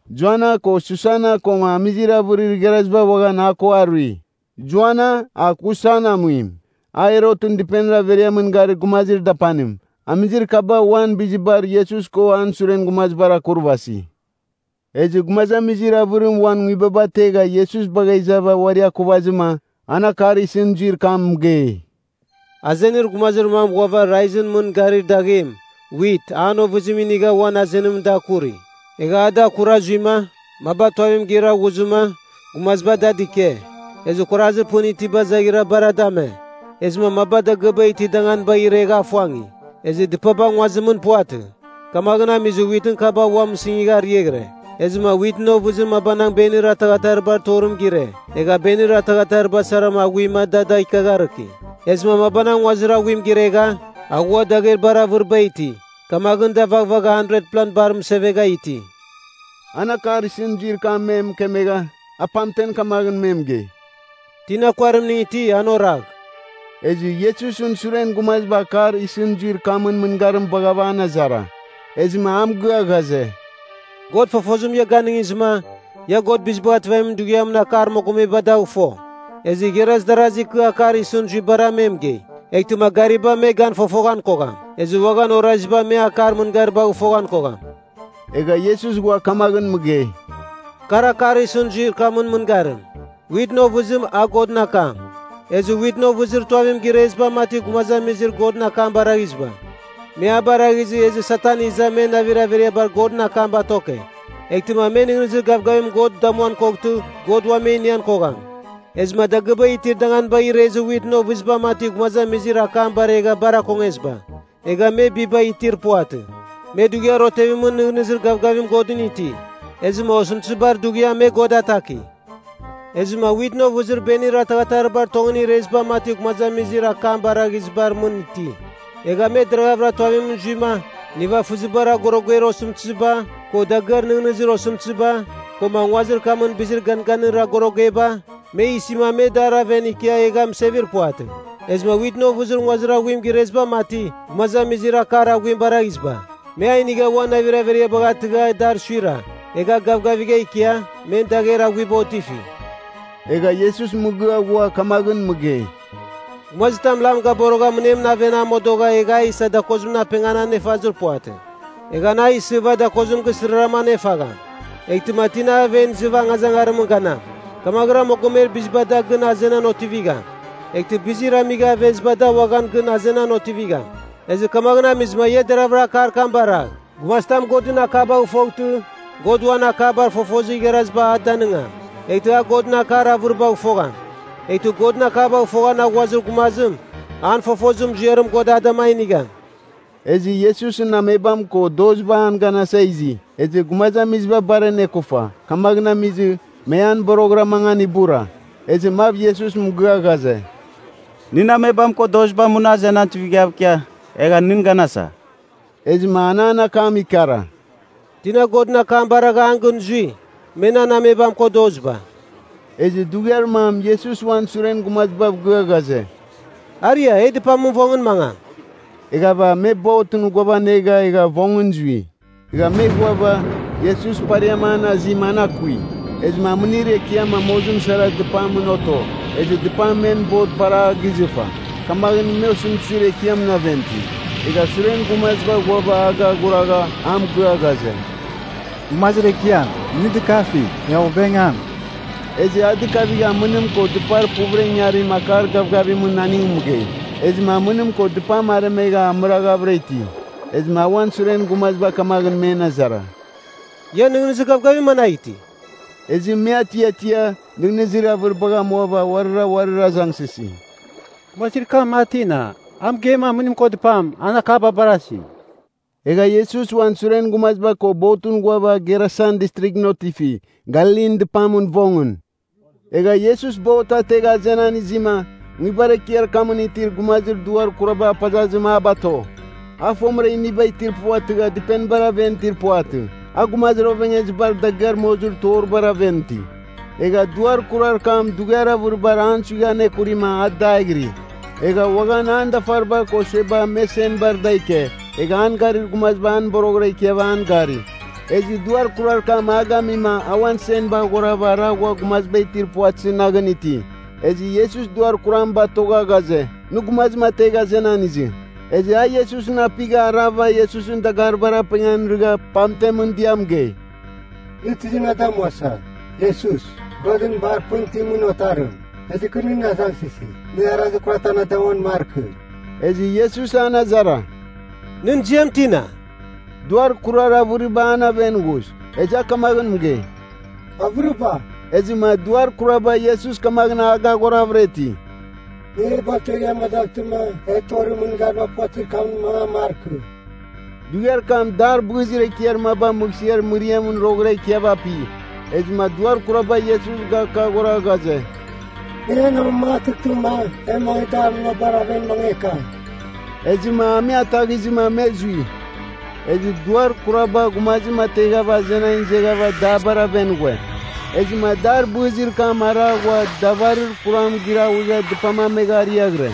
Joana ko Susana koma amizir avɨrir igharaziba uaghan a ko arui. (Joana, a Kusan amuim, a Herotɨn dɨpenir averiamɨn garir gumazir dapanim.) Amizir kaba uan bizibar Iesus ko an suren gumazibar akurvasi. Ezɨ gumazamizir avɨrim uan nguibaba ategha Iesus bagha izava uari akuvazɨma, an akar isɨn zuir kam mɨgei: “Azenir gumazir mam ghuava raizɨn mɨn garir daghem, wit, an ovɨziba inigha uan azenimɨn da akuri. Egha a da akura zuima, maba tuavim gira ghuzɨma gumaziba da dɨke. Ezɨ kuarazir pɨn itiba izaghira bar da ame. Ezɨma maba dagɨaba itir danganibagh iregha afuangi. Ezɨ dɨpaba nguazimɨn puvatɨ, kamaghɨn amizɨ witɨn kaba ua mɨsɨngigha ariaghɨre. Ezɨma witɨn ovɨzir mabanang benir ataghataribar torim gire, egha benir ataghatariba sara aghuima da da ikiagharɨki. Ezɨma mabanang nguazir aghuim giregha, aghua dagher bar avɨriba iti, kamaghɨn da vaghvagha 100pla bar mɨsevegha iti.” An akar isɨn zuir kam me mɨkemegha, a pamtem kamaghɨn me mɨgei, “Tina kuarimning iti, an oragh.” Ezɨ Iesusɨn suren gumaziba akar isɨn zuir kamɨn mɨngarim baghava an azara. Ezɨma a mɨgɨa ghaze, “God fofozim ia ganɨngizɨma, ia God Bizibagh Ativamin Dughiamɨn akar mogomeba dagh fo. Ezɨ igharaz darazi kɨ akar isɨn zuibara me mɨgei, eghtɨma gariba me gan fofoghan kogham, ezɨ uaghan oraziba me akar mɨngaribagh foghan kogham.” Egha Iesus ghua kamaghɨn mɨgei, “Kar akar isɨn zuir kamɨn mɨngarim. Witɨn ovɨzim a Godɨn akam. Ezɨ witɨn ovɨzir tuavim gireziba mati gumazamizir Godɨn akam baraghiziba, me a baraghizɨ ezɨ Satan iza men navir averiabar Godɨn akam batoke, eghtɨma me nɨghnɨzir gavgavim God damuan koghtɨ God ua me inian kogham. Ezɨma dagɨaba itir danganibagh irezir witɨn ovɨziba mati gumazamizir akam baregha bar akongeziba, egha me biba itir puvatɨ. Me dughiar otevimɨn nɨghnɨzir gavgavim Godɨn iti, ezɨma osɨmtɨzibar dughiam me God ataki. Ezɨma witɨn ovɨzir benir ataghataribar tongɨn ireziba mati gumazamizir akam baraghizibar mɨn ti. Egh me deragha tuavimɨn zuima nivafɨzibar agoroger osɨmtɨziba, ko dagɨar nɨghnɨzir osɨmtɨziba, koma nguazir kamɨn bizir ganganir agorogeba, me isima me dar aven ikia egha mɨsevir puvatɨ. Ezɨma witɨn ovɨzir nguazir aghuim gireziba mati, gumazamizir akar aghuim baraghiziba, me a inigha uan navir averiabagh atɨgha adar suira egha gavgavigha ikia, men dagher aghuiba otifi.” Egha Iesus mɨgɨa ghua kamaghɨn mɨgei, “Gumazitam lam gaborogha mɨnemɨn aven a modogha egha a isa dakozimɨn apengan anefazir puvatɨ. Egh an a isɨva dakozim gisɨrarama anefagham, eghtɨma tina aven izɨva angazangarimɨn ganam. Kamaghɨra mogomer biziba da gɨn azenan otivigham. Eghtɨ bizir amigha aveziba da uaghan gɨn azenan otivigham. Ezɨ kamaghɨn amizɨma ia deraghvɨra akar kam baragh. Gumazitam Godɨn akabagh foghtɨ, God uan akabar fofozir igharaziba a danɨngam, eghtɨ a Godɨn akar avɨribagh fogham. Eghtɨ Godɨn akabagh foghan aghuazir gumazim, an fofozir muziarim God a dama inigham.” Ezɨ Iesusɨn amebam ko doziba an ganasa izi. Ezɨ gumazamiziba bar anekufa, kamaghɨn amizɨ, me an boroghɨra mangan ibura. Ezɨ mav Iesus mɨgɨa ghaze, “Nɨn amebam ko doziba muna azenan tuivighav ikia, egha nɨn ganasa.” Ezɨma an an akam ikara, “Tina Godɨn akam baragha an gɨn zui, me nan amebam ko doziba.” Ezɨ dughiar mam Iesus uan suren gumazibav gɨa ghaze, “Aria e dɨpamɨn vongɨn mangam.” Eghava me botɨn ghuavanega egha vongɨn zui. Egha me ghuava, Iesus pariam an azima an akui. Ezɨma amɨnir ekiam amozim sara dɨpamɨn oto, ezɨ dɨpam men bot bar a gizɨfa. Kamaghɨn me osɨmtɨzir ekiamɨn aven iti. Egha suren gumaziba ghuava a gaghuragha a mɨgɨa ghaze, “Gumazir Ekiam, nɨ dɨkafigh! E ovengam!” Ezɨ a dɨkavighava amɨnim ko dɨpar puvɨra ingarim akar gavgavimɨn aning mɨgei. Ezɨma amɨnim ko dɨpam aremegha amɨraghavɨra iti. Ezɨma a uan suren gumaziba kamaghɨn men azara, “Ian nɨghnɨzir gavgavim managh iti?” Ezɨ me atiatia, nɨghnɨzir avɨribagh amuava, uarira uarir azangsɨsi, “Gumazir kam, a tina? A mɨgeima amɨnim ko dɨpam, an akam barasi.” Egha Iesus uan suren gumaziba ko botɨn ghuava Gerasan Distrighɨn otifi, Galilin dɨpamɨn vongɨn. Egha Iesus bot ategha azenan izima, nguibar ekiar kamɨn itir gumazir duar kuraba apazazim a bato. A fomɨra iniba itir puvatɨghava dɨpenibar aven itir puvatɨ, a gumazir ovengezibar dagɨar mozir toribar aven iti. Egha duar kurar kam dughiar avɨribar an suigha anekurima a daghiri. Egha uaghan an dafariba ko sueba me senbar da ike, egha an garir gumaziba an boroghɨra ikiava an gari, ezɨ duar kurar kam a gamima a uan senba aghorava ara ghua gumaziba itir puvatɨzɨ naghɨn iti. Ezɨ Iesus duar kuram batogha ghaze, nɨ gumazim ategh azenan izɨ. Ezɨ a Iesusɨn apigha, arava Iesusɨn dagaribar apengan irɨgha pamtem dɨa mɨgei, “Nɨ tizim na damuasa, Iesus, Godɨn bar pɨn itimɨn otarim? Ezɨ kɨ nɨn azangsɨsi nɨ arazir kuratam na damuam markɨ!” Ezɨ Iesus an azara, “Nɨn ziam tina?” Duar kurar avɨriba an aven ghuz. Ezɨ a kamaghɨn mɨgei, “Avɨriba.” Ezɨma duar kuraba Iesus kamaghɨn a gaghoravɨra iti, “Nɨ e batoegh e amadaghtɨma e torir mɨngariba puvatɨzir kamɨn mangan markɨ.” Dughiar kam dar bɨzir ekiar maba mɨghsɨar mɨriamɨn roghɨra ikiava api. Ezɨma duar kuraba Iesus gakaghora ghaze, “Nɨ en amamangatɨghtɨma e mangɨ dar munabar aven mangeka.” Ezɨma a me ataghizɨma me zui. Ezɨ duar kuraba gumazim ateghava azenan izeghava dabar aven ghue. Ezɨma dar bɨzir kam ara ghua davarir kuram giraghuegha dɨpam amegha ariaghɨre.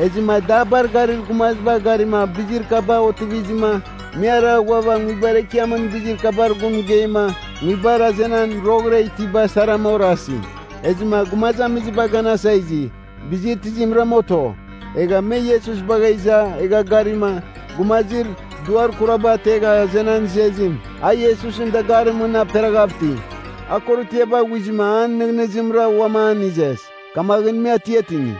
Ezɨma dabar garir gumaziba garima bizir kaba otivizɨma, me ara ghuava nguibar ekiamɨn bizir kabar gun mɨgeima nguibar azenan roghɨra itiba sarama orasi. Ezɨma gumazamiziba ganasa izi, bizir tizimrama oto? Egha me Iesus bagha iza, egha garima, gumazir duar kuraba ategha azenan izezim, a Iesusɨn dagarimɨn mɨn aperaghav iti. A korotiaba aghuizɨma an nɨghnɨzimra uam an izes. Kamaghɨn me atiatingi.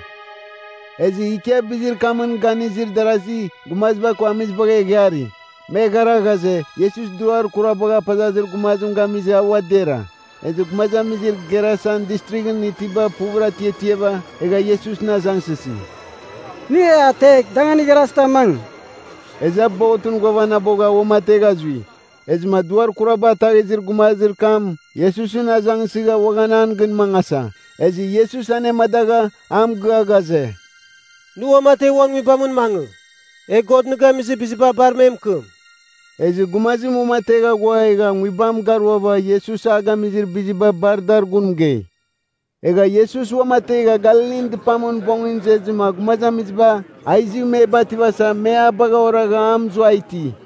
Ezɨ ikia bizir kamɨn ganizir darasi gumaziba ko amizibagh eghari, me eghara ghaze, Iesus duar kuraba apazazir gumazim gamizɨ a ua dera. Ezɨ gumazamizir Gerasan Distrighɨn itiba puvɨra atiatiava, egha Iesusɨn azangsɨsi, “Nɨ e ategh danganir igharazimɨn mangɨ.” Ezɨ a botɨn ghuavanabogha uamategha zui. Ezɨma duar kuraba ataghizir gumazir kam Iesusɨn azangsɨgha uaghan an gɨn mangasa, ezɨ Iesus anemadagha, a mɨgɨa ghaze, “Nɨ uamategh uan nguibamɨn mangɨ, egh God nɨ gamizir biziba bar me mɨkɨm.” Ezɨ gumazim uamategha ghua egha nguibam garuava Iesus a gamizir biziba bar dar gun mɨgei. Egha Iesus uamategha Galilin dɨpamɨn vongɨn izezɨma gumazamiziba a izɨ me bativasa me a bagha oragha a mɨzua iti.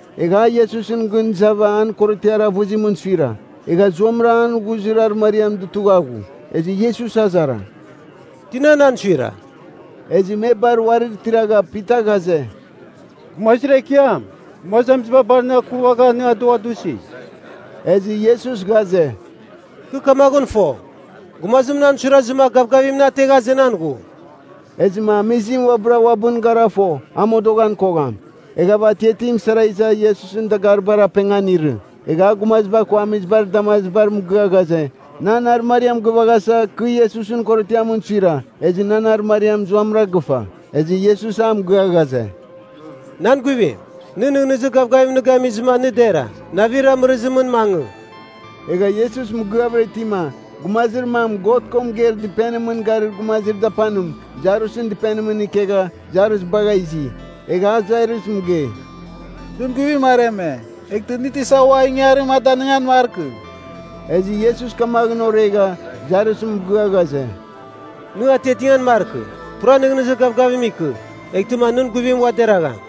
Egha a Iesusɨn gɨn izava an korotiar avɨzimɨn suira, egha zuamɨra an ghuzir arɨmariam dutugha ghu. Ezɨ Iesus azara, “Tina nan suira?” Ezɨ me bar uarir tiragha Pita ghaze, “Gumazir Ekiam, gumazamiziba bar nɨ akuvagha nɨ adughadusi.” Ezɨ Iesus ghaze, “Kɨ kamaghɨn fo, gumazim nan suirazɨma gavgavim na ategha azenan ghu.” Ezɨma amizim uabɨra uabɨn gara fo, a modoghan kogham. Eghava atiatim sara iza Iesusɨn dagaribar apengan irɨ. Egha a gumaziba ko amizibar damazibar mɨgɨa ghaze, nan arɨmariam gɨvaghasa, kɨ Iesusɨn korotiamɨn suira, ezɨ nan arɨmariam zuamɨra gɨfa. Ezɨ Iesus a mɨgɨa ghaze, “Nan guivim, nɨ nɨghnɨzir gavgavim nɨ gamizɨma nɨ dera. Navir amɨrɨzimɨn mangɨ.” Egha Iesus mɨgɨavɨra itima, gumazir mam God ko mɨgeir dɨpenimɨn garir gumazir dapanim, Jairusɨn dɨpenimɨn ikegha, Jairus bagha izi. Egha a Jairus mɨgei, “Nɨn guivim areme. Eghtɨ nɨ tisa ua ingangarim a danɨngan markɨ.” Ezɨ Iesus kamaghɨn oregha, Jairus mɨgɨa ghaze, “Nɨ atiatingan markɨ. Pura nɨghnɨzir gavgavim ikɨ eghtɨma nɨn guivim ua deragham.”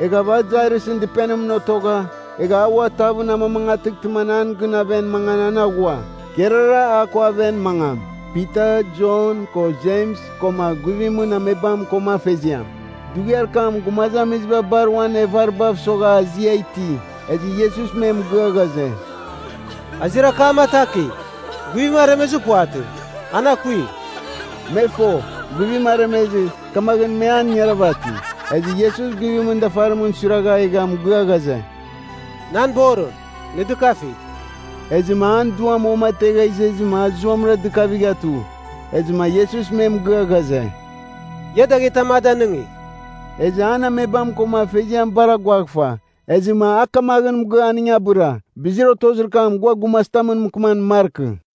Eghava a Jairusɨn dɨpenimɨn otogha, egha a ua tavɨn amamangatɨghtɨma an an gɨn aven mangan an aghua, kerara a ko aven mangam, Pita, Jon, ko Jems koma guivimɨn amebam koma afeziam. Dughiar kam gumazamiziba bar uan evaribav mɨsogha azia iti. Ezɨ Iesus me mɨgɨa ghaze, “Azir akam atakigh. Guivim aremezɨ puvatɨ. An akui.” Me fo, guivim aremezɨ, kamaghɨn me an ingaravati. Ezɨ Iesus guivimɨn dafarimɨn suiragha egha mɨgɨa ghaze, “Nan borim, nɨ dɨkafigh!” Ezɨma an duam uamategha izezɨma a zuamɨra dɨkavigha tu. Ezɨma Iesus me mɨgɨa ghaze, “Ia daghetam a danɨngigh.” Ezɨ an amebam koma afeziam bar aguaghfa. Ezɨma a kamaghɨn mɨgɨa aning abɨra, bizir otozir kam gua gumazitam mɨkɨman markɨ.